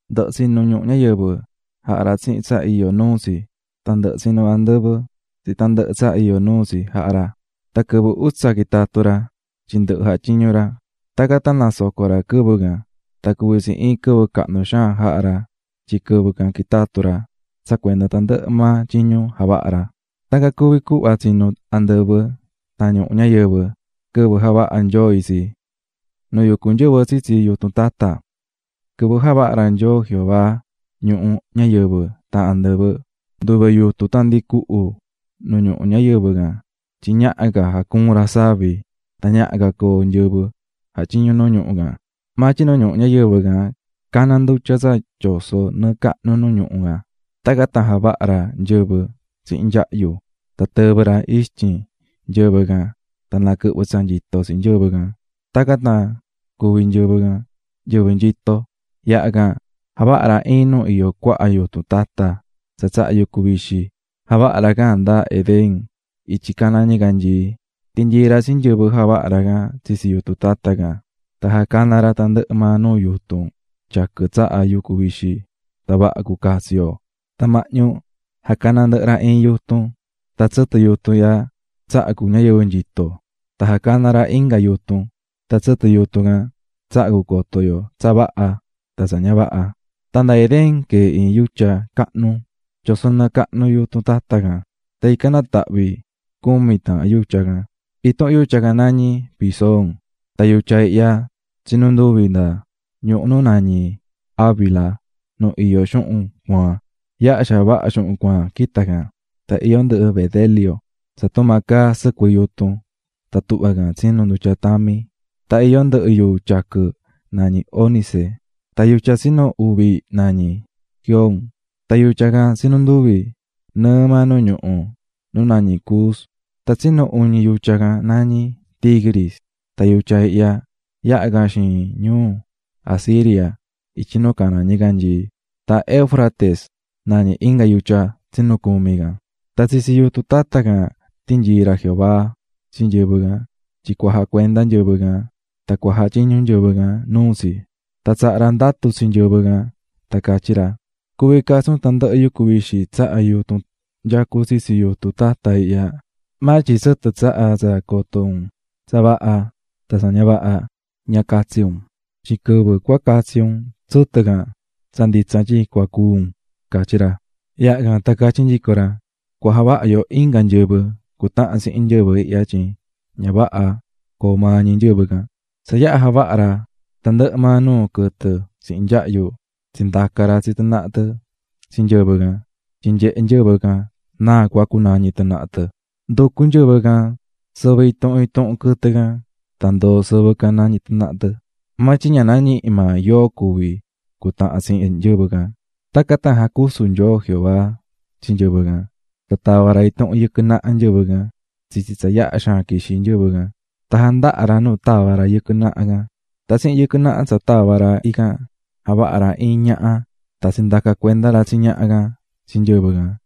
Ndɨhɨ̱ tsinu̱ ñuhu ñayɨvɨ jaha̱ ra tsihin tsa iyó nuu tsi, tan ndɨhɨ̱ tsinu̱ andɨvɨ tsihin tandɨhɨ tsa iyó nuu tsi jaha̱ ra. Tan quɨvɨ utsa quitatu̱ ra, tyin ndɨhɨ̱ jatyiñu̱ ra. Tacan tan nasoco̱ ra quɨvɨ can, tan cuví tsi iin quɨvɨ cahnu xaan jaha̱ ra tyin quɨvɨ can quitatu̱ ra tsa cuenda tandɨhɨ maa tyiñu javaha̱ ra. Tacan cuví cuhva tsinu̱ andɨvɨ tan ñuhu ñayɨvɨ quɨvɨ javaha̱ Nyoo itsi. Nu yucú nyɨvɨ tsitsi yutun tata Quɨvɨ javaha̱ ra Nyoo Jehová ñuhu ñayɨvɨ tan andɨvɨ, nduve yutun tan ndi cuhu nu ñuhu ñayɨvɨ can tyin ñaha ca jacuun ra savi tan ñaha ca coo nyɨvɨ jatyiñú nu ñuhu can. Maa tyin nu ñuhu ñayɨvɨ can caná ndutya tsa tyosó nɨɨ cahnu nu ñuhu can. Tacan tan javaha̱ ra iin nyɨvɨ tsihin nyahyu. Tan tɨvɨ̱ ra ixtyin nyɨvɨ can tan naquɨhvɨ̱ tsa nyito tsi nyɨvɨ can, tacan tan cuvi̱ nyɨvɨ can nyɨvɨ nyito. Yaha can, javaha̱ ra iin nu iyó cuaha yutun tata tsa tsahá yucu vixi. Javaha̱ ra can nda Edén ityi nu caná ñicanyii. Tinyii̱ ra tsi nyɨvɨ javaha̱ ra can tsitsi yutun tata can. Tan jacana̱ ra tandɨhɨ maa nuu yutun tyaquɨ tsahá yucu vixi, tan vaha cu catsi yo. Tan mahñu jacana̱ ndɨhɨ ra iin yutun, tan tsɨtɨ yutun ihya tsahá cu ñayɨvɨ nyito, tan jacana̱ ra inga yutun, tan tsɨtɨ yutun can tsahá cu coto yo tsa vaha tan tsa ña vaha. Tan nda Edén canyií iin yutya, ican queé ndutya tyosó nɨɨ cahnu yutun tata can, tan ican natahvi̱ cumi taahan yutya. Intuhun yutya can nañí Pisón; tan yutya ihya tsinú nduvi nda ñuhu nu nañí Havila nu iyó xuhun cuaan. Yaha xaan vaha xuhun cuaan quitá can. Tan iyó ndɨhɨ bedelio (caá can tumaa caá sɨcuɨ yutun, tuhvá can tsinú ndutya tami). Tan iyó ndɨhɨ yuu tyaquɨ nañí ónice. Tan yutya tsinu uvi, nañí Gihón. Tan yutya ihya tsinú nduvi nɨɨ maa nu ñuhu nu nañí Cus. Tan yutya tsinu uñi, nañí Hidekel tan yutya ihya yahá can xiin ñuu Asiria ityi nu caná ñicanyii. Tan Éufrates nañí yutya tsinu cumi. Tan tsitsi yutun tata can tinyii̱ ra Jehová tsi nyɨvɨ can tyin cua jacuenda nyɨvɨ can tan cua jatyiñu nyɨvɨ can nuu tsi. Tan tsaha̱ ra ndatu tsi nyɨvɨ can tan catyí ra: "Cuví catsi un tandɨhɨ yucu vixi tsahá yutun nyacú tsitsi yutun tata ihya, maa tyin tsɨtɨ tsahá tsa coto un tsa vaha tan tsa ña vaha, ña catsi un. Tyin quɨvɨ cua catsi un tsɨtɨ can, tsa nditsa tyin cua cúu un", catyí ra. Yaha can tan catyí nyico ra: "Cua javaha yu inga nyɨvɨ cutahan tsihin nyɨvɨ ihya tyin ña vaha coo maa ñi nyɨvɨ ihya." Tsa yaha javaha̱ ra tandɨhɨ maa nuu quɨtɨ tsihin nyahyu, tsindaca̱ ra tsi tɨ naha tɨ tsi nyɨvɨ can tyin nyehe nyɨvɨ can náa cua cunañi tɨ naha tɨ. Nducu̱ nyɨvɨ can sɨvɨ intuhun intuhun quɨtɨ can. Tan ndoo̱ sɨvɨ can nañí tɨ naha tɨ. Maa tyin ña nañihi̱ maa yóo cuvi cutahan tsihin nyɨvɨ can. Tacan tan jacusu̱ Nyoo Jehová tsi nyɨvɨ can, tan tava̱ ra intuhun yɨquɨ naha nyɨvɨ can tsitsi tsa yaha xaan quixí nyɨvɨ can, tan jandaha̱ ra nu tava̱ ra yɨquɨ naha can. Tan tsihin yɨquɨ naha tsa tava̱ ra ican, javaha̱ ra iin ñaha. Tan tsindaca̱ cuenda ra tsi ñaha can tsi nyɨvɨ can.